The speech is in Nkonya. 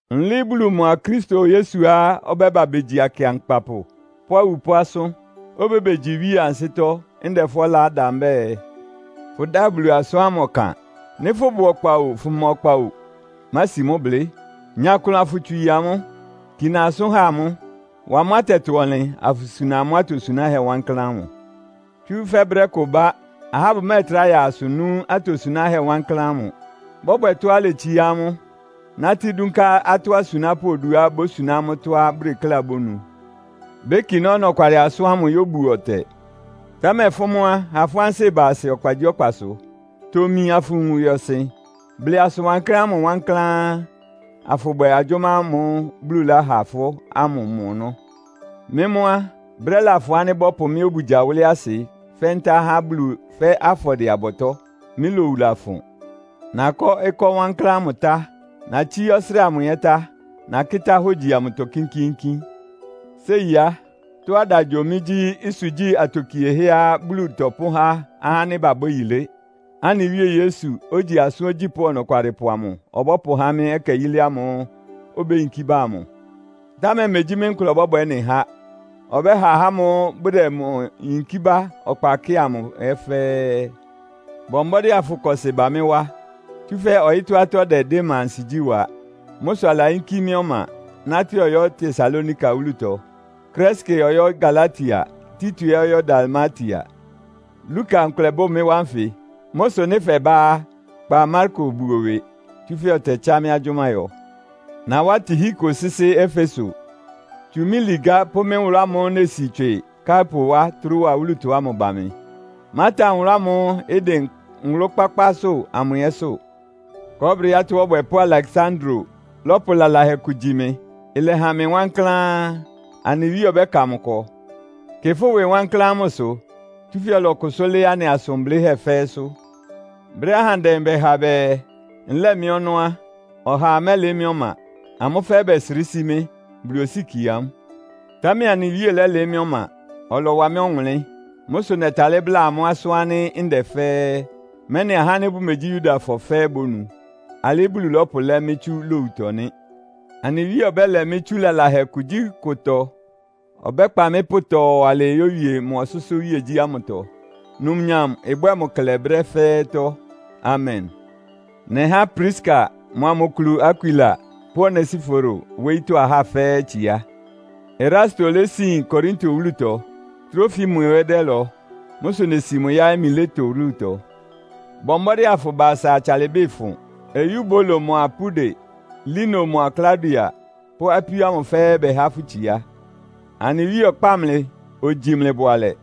Nlɩɩ́ Bulu mʋa Kristo Yesuá ɔbɛ́ba begyi akɩankpapʋ pʋ́ awupʋ́ asʋ́n, obébegyi iwíe ansɩ́tɔ́, ndɛ fʋ́ ɔlá da mbɛ́ɛ, fʋdáa Bulu asʋ́n ámʋ ɔkan. Nɩ́ fʋ́bʋ ɔkpa o, fʋma ɔkpa o, mási mʋ́ blɩ́. Nya klʋn afʋtswii amʋ́. Kina asʋ́n ha amʋ́. Wa amʋ́ atɛtɔ-ɔnlɩn, afʋsuna amʋ́ atosunáhɛ́ wankláán ámʋ. Tsúfɛ́ brɛ́ kʋ ɩbá, ahá bʋmɛ́ɛtrá ya asʋ nú atosunáhɛ́ wankláán ámʋ. Bɔbwɛ tɔ́á iletsiá amʋ́, nátɩ́ dúnká atɔ́ asunápʋ́ oduá bósuná amʋ́ tɔ́á bʋdekléá bónu. Békiná ɔnɔkwalɩ asʋ́n ámʋ yóbuo ɔtɛ. Támɛ fʋ́ mʋ́ á, ha fʋ́ ansɩ́ ɩba asɩ ɔkpagyíɔkpasʋ. Tomi afʋwun ɩwɩɔsɩn. Blɩ asʋn wankláán ámʋ wankláán, afʋbwɛ agyʋ́má ámʋ́ʋ́ Bulu lɛ́ha fʋ́ ámʋ mɔ ɔnɔ́. Mɩ́ mʋ́ á, brɛ́ lafʋn ánɩ́ bɔ́pʋ mɩ́ obugya wʋ́lɩ́ asɩ fɛ́ ntá há Bulu fɛ́ afɔdɩɛ-abɔtɔ́. Mɩ́ lowu lafʋn. Nakɔ́ ɩkɔ́ wankláán ámʋ tá. Natsíí ɔsrɩ́ɩ amʋ ɛ́ tá. Nakɩ́tá hógyi amʋtɔ kínkíínkín. Séi á, tɔ́á ɩda gyo mɩ gyí ɩsʋgyí atokiehɛ́á Bulu tɔpʋ́há ahá ánɩ́ babwɛ́ yilé, anɩ Wíe Yesu, ogyi asʋ́n ogyípʋ́ Ɔnɔkwalɩpʋ amʋ ɔbɔ́pʋhá mɩ́ ɛkɛ yilé ámʋ́ʋ́ obéyinkí ba amʋ. Támɛ megyí mɩ́ nkʋlɛ ɔbɔ́bwɛ ɩ́nɩ há. Ɔbɛ́ha ahá ámʋ́ʋ́ bʋdɛ mʋ yinkí bá ɔkpa kɩ́ɩ amʋ ɛ́ fɛ́ɛ́. Bɔ mbɔ́dɩ́ afʋkɔsɩ ba mɩ́ wá, tsúfɛ́ ɔyɩ́tɔ́ atɔ́ dɛ Dema ansigyí wa. Mʋ́ sʋ alayínkí mɩ́ ɔma, nátɩ́ ɔyɔ́ Tesalonika wúlutɔ. Kreske ɔyɔ́ Galatia, Tito ɛ́ ɔyɔ́ Dalmatia. Luka nkʋlɛ bʋ mɩ́ wá nfɩ. Mʋ́ sʋ nɩ́ fɛbá á, kpa Marko buo ɩwɩ, tsúfɛ́ ɔtɛtsá mɩ́ agyʋ́má yɔ. Nawá Tihiko sɩ́sɩ́ Efeso. Tsu mɩ́ ligá pʋ́ mɩ́ nwʋlʋ́ ámʋ́ʋ́ nesi tswɩ Karpo wá Troa wúlutɔ ámʋ ba mɩ. Mátan nwʋlʋ́ ámʋ́ʋ́ ɩdɩn nwʋlʋ́-kpákpásʋ́ amʋ ɛ́sʋ́. Kɔɔ́brɩ atɔ́ ɔbwɛpʋ́ Aleksandro lɔ́pʋ lalahɛ kʋ gyi mɩ. Ɩlɛhan mɩ wankláán. Anɩ Wíe ɔbɛ́ka mʋ ɩkɔ. Kɩ fʋ́ ɩwɩ wankláán mʋsʋ, tsúfɛ́ ɔlɔkʋsʋ́ lɩ́ɩ́ anɩ asʋn blɩ́hɛ́ fɛ́ɛ́sʋ́. Brɛ́á ahandɛ bɛha bɛɛ nlɛ́ɛ mɩ́ ɔnɔ́ á, ɔhaa mɛ́lɩɩ́ mɩ́ ɔma. Amʋ́ fɛ́ɛ́ bɛsrɩ́ sí mɩ́. Bulu osíkie amʋ́. Támɛ anɩ Wíe lɛ́lɩɩ́ mɩ́ ɔma, ɔlɔwa mɩ́ ɔwʋnlɩ́n. Mʋ́ sʋ nɛtalɩ́ bláa amʋ́ asʋ́n ánɩ́ ndɛ fɛ́ɛ́, mɛ́nɩ ahá ánɩ́ bʋmegyí Yudafɔ fɛ́ɛ́ bónu. Alɩ́ Bulu lɔ́pʋlɛ́ mɩ́ tsú lowutɔ nɩ́. Anɩ Wíe ɔbɛ́lɛ mɩ́ tsú lalahɛ kugyíkʋtɔ. Ɔbɛ́kpa mɩ́ pʋtɔɔ alɩɩ yówie mʋ ɔsʋ́sʋ́ iwíegyí ámʋtɔ. Numnyam ɩbwɛ́ɛ mʋ klɛ brɛ́ fɛ́ɛ́tɔ́. Amen. Nɛhá Priska mʋa mʋ kulu Akwila pʋ́ Onesiforo wóyítɔ́ ahá fɛ́ɛ́ itsiá. Erasto lésin Korinto wúlutɔ, Trofimo ɛ́ dɛ́lɔ. Mʋ́ sʋ nesi mʋ yáɩ́ Mileto wúlutɔ. Bɔ mbɔ́dɩ́ afʋba asa atsalɩbɩ́ ɩfʋn. Eyubulo mʋa Pude, Lino mʋa Klaudia pʋ́ apíó ámʋ fɛ́ɛ́ bɛhá fʋ́ itsiá. Anɩ Wíe ɔkpáa mlɩ, ogyi mlɩ bʋalɛ.